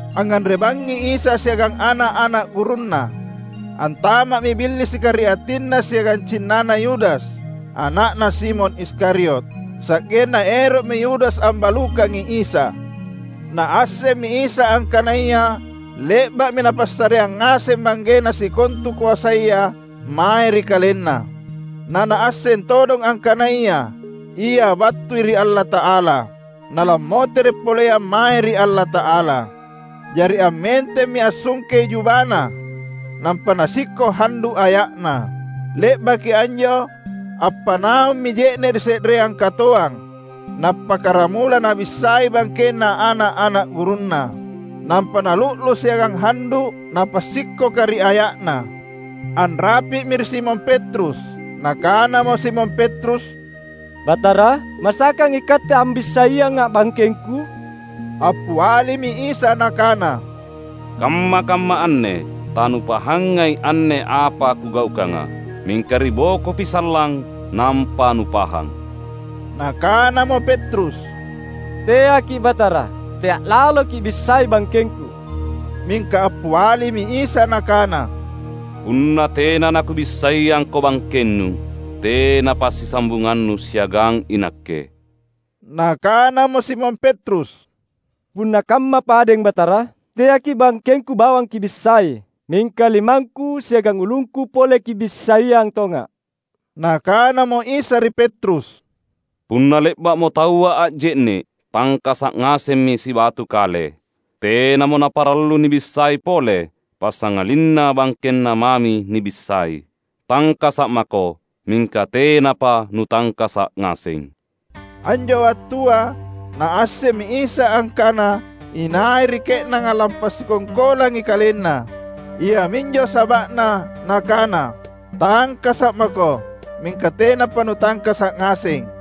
Angnganre bangngi Isa siagang ana’-ana’ gurunNa. Antama’mi Billisika ri atinna siagang cinnana Yudas, ana’na Simon Iskariot, sa’genna ero’mi Yudas ambalukangi Isa. Naassemmi Isa angkanaya le’ba’mi Napassareang ngaseng ManggeNa sikontu koasaya mae ri KalenNa. Na Naasseng todong angkanaya Ia battui ri Allata’ala, nalammotere’ poleang mae ri Allata’ala. Jari ammentemmi assungkei jubaNa, nampa Nasikko’ handu’ aya’Na. Le’baki anjo appanaummi je’ne’ ri se’reang katoang, nappakkaramula Nabissai bangkenna ana’-ana’ gurunNa. Nampa Nalu’lu’ siagang handu’ Napasikkoka ri aya’Na. Anrapi’mi ri Simon Petrus. Nakanamo Simon Petrus, "Batara, masakang iKatte ambissaianga’ bangkengku?" Appialimi Isa Nakana, "Kamma-kamma anne tanupahangai anne apa Kugaukanga; mingka ri bokopi sallang nampa nupahang!" Nakanamo Petrus, "TeaKi’ Batara; tea laloKi’ bissai bangkengku!" Mingka appialimi Isa Nakana, "Punna tena naKubissaiangko bangkennu, tena passisambungannu siagang iNakke." Nakanamo Simon Petrus, "Punna kamma padeng Batara, teaKi’ bangkengku bawang Kibissai, mingka limangku siagang ulungku pole Kibissaiang tonga’!" Nakanamo Isa ri Petrus, "Punna le’ba’mo taua a’je’ne’, tangkasa’ ngasemmi sibatu kale. Tenamo naparallu nibissai pole; passangalinna bangkenna mami nibissai. Tangkasa’ mako, mingka tenapa nutangkasa’ ngaseng." (Anjo wattua Naassemmi Isa angkana inai ri ke’nangalampasikongkolangi KalenNa. Iaminjo saba’ na Nakana, "Tangkasa’ mako mingka tenapa nutangkasa’ ngaseng.")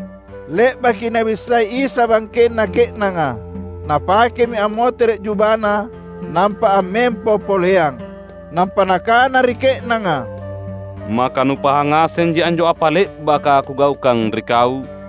Le’baki Nabissai Isa bangkenna ke’nanga, Napakemi ammotere’ jubaNa nampa ammempo poleang. Nampa Nakana ri ke’nanga, "Maka nupahang ngasenji anjo apa le’baka Kugaukang ri kau?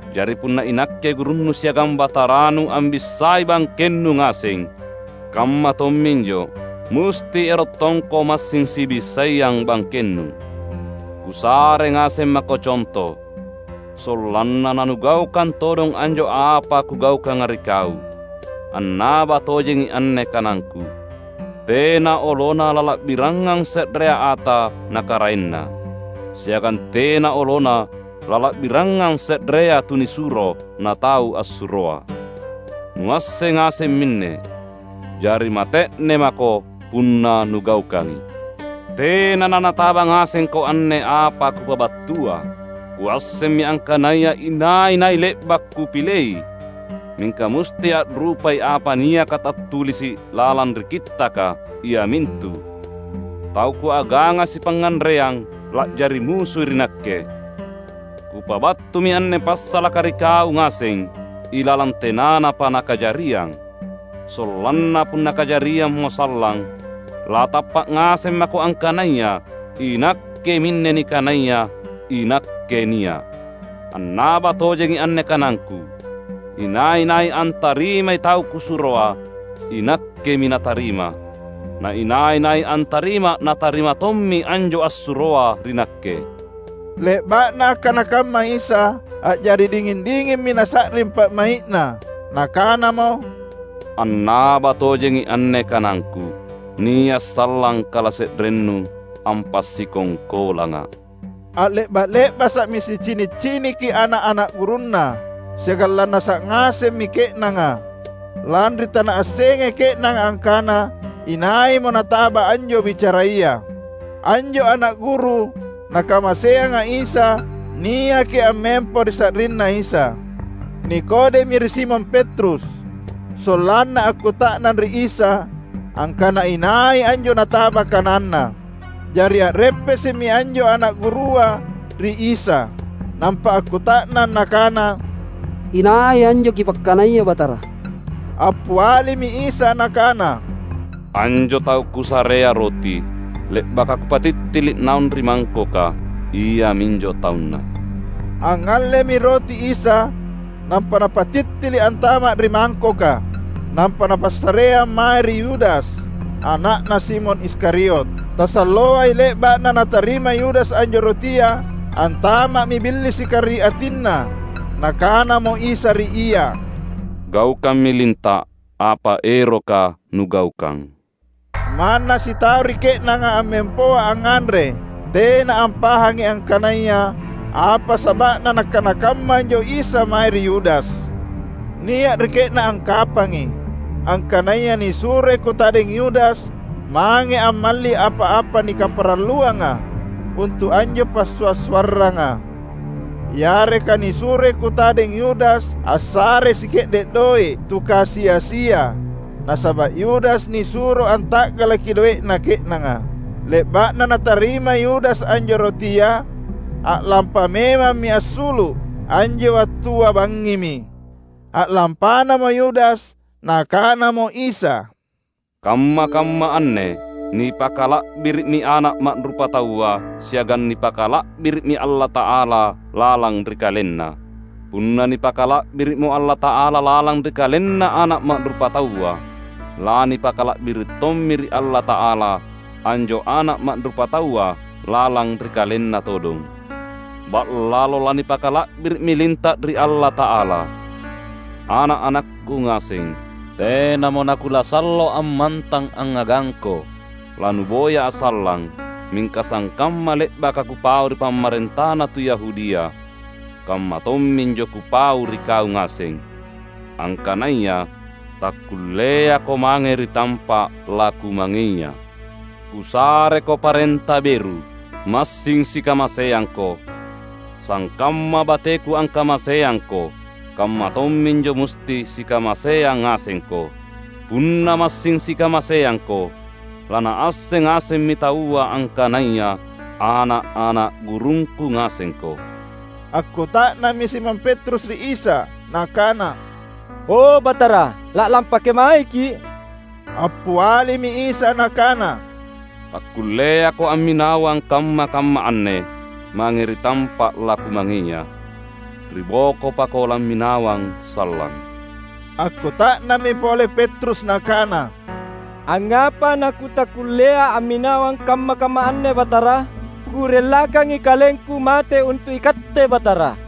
Jari punna iNakke Gurunnu siagang Bataranu ambissai bangkennu ngaseng, kamma tomminjo musti ero’ tongko massing sibissaiang bangkennu. Kusare ngaseng mako conto, sollanna nanugaukang todong anjo apa Kugaukanga ri kau. Annaba tojengi anne kanangKu: tena olona lala’birangang se’rea ata na karaenna; siagang tena olona lala’birangang se’rea tunisuro na tau assuroa. Nuasseng ngaseng minne; jari mate’ne mako punna nugaukangi. Tena nanataba ngasengko anne apa Kupabattua. Kuassemmi angkanaya inai-nai le’ba’ Kupilei. Mingka musti a’rupai apa niaka tattulisi’ lalang ri Kittaka, iamintu, ‘Tau Kuaganga sipangnganreang, la’jari musui ri Nakke.’ Kupabattumi anne passalaka ri kau ngaseng, ilalang tenanapa nakajariang. Sollanna punna kajariammo sallang, latappa’ ngaseng mako angkanaya iNakke minne nikanaya INAKKE NIA’. Annaba tojengi anne kanangKu: Inai-nai antarimai tau Kusuroa, Inakkemi natarima. Na inai-nai antarimA’, natarima tommi anjo assuroa ri Nakke." Le’ba’na akkana kamma Isa, a’jari dinging-dingimmi nasa’ring pa’mai’Na. Nakanamo, "Annaba tojengi anne kanangKu: Nia’ sallang kalase’rennu ampasikongkolangA’." A’le’ba’-le’basa’mi sicini’-ciniki ana’-ana’ gurunNa, siagang lannasa’ ngasemmi ke’nanga, lanri tanaassengai ke’nanga angkana inaimo nataba anjo bicaraya. Anjo ana’ guru Nakamaseanga Isa niaki ammempo ri sa’rinNa Isa. Nikodemi ri Simon Petrus, sollanna akkuta’nang ri Isa angkana inai anjo nataba kananNa. Jari a’reppese’mi anjo ana’ gurua ri Isa, nampa akkuta’nang nakana, "Inai anjo Kipakkanaya, Batara?" Appialimi Isa Nakana, "Anjo tau Kusarea roti, le’baka Kupatittili’ naung ri mangkoka, iaminjo taunna." Angngallemi roti Isa nampa Napatittili’ antama’ ri mangkoka; nampa Napassareang mae ri Yudas, ana’na Simon Iskariot. Tasalloai le’ba’na natarima Yudas anjo rotia, antama’mi Billisika ri atinna. Nakanamo Isa ri ia, "Gaukammi linta’ apa eroka nugaukang." Manna sitau ri ke’nanga ammempoa angnganre, tena ampahangi angkanaya apa saba’na Nakkana kamma anjo Isa mae ri Yudas. Nia’ ri ke’nanga angkapangi, angkanaya nisuroi kutadeng Yudas mange ammalli apa-apa nikaparalluanga untu’ anjo passua’-suarranga. Yareka nisuroi kutadeng Yudas assarei sike’de’ doe’ tu kasi-asia — nasaba’ Yudas nisuro anta’galaki doe’na ke’nanga. Le’ba’na natarima Yudas anjo rotia, a’lampa memammi assulu’. Anjo wattua bangngimi. A’lampanamo Yudas, Nakanamo Isa, "Kamma-kamma anne nipakala’biri’mi Ana’ Ma’rupataua, siagang nipakala’biri’mi Allata’ala lalang ri KalenNa. Punna nipakala’biri’mo Allata’ala lalang ri KalenNa Ana’ Ma’rupataua, lanipakala’biri’ tommi ri Allata’ala anjo Ana’ Ma’rupataua lalang ri KalenNa todong. Ba’lalo lanipakala’biri’mi linta’ ri Allata’ala. Ana’-anakKu ngaseng, tenamo naKulasallo ammantang angngagangko. LanuboyA’ sallang, mingka sangkamma le’baka Kupau ri pamarentana tu Yahudia, kamma tomminjo Kupau ri kau ngaseng; angkanaya takkulleako mange ri tampa’ laKumangeia. Kusareko parenta beru: Massing sikamaseangko. Sangkamma bateKu angkamaseangko, kamma tomminjo musti sikamaseang ngasengko. Punna massing sikamaseangko, lanaasseng ngasemmi taua angkanaya ana’-ana’ gurungKu ngasengko." Akkuta’nammi Simon Petrus ri Isa, nakana, "O Batara, la’lampa kemaeKi’?" Appialimi Isa Nakana, "Takkulleako amminawang kamma-kamma anne, mange ri tampa’ laKumangeia. Ri bokopako lamminawang sallang." Akkuta’nammi pole Petrus nakana, "Angngapa nakutakkullea amminawang kamma-kamma anne Batara? Kurellakangi kalengku mate untu’ iKatte Batara!"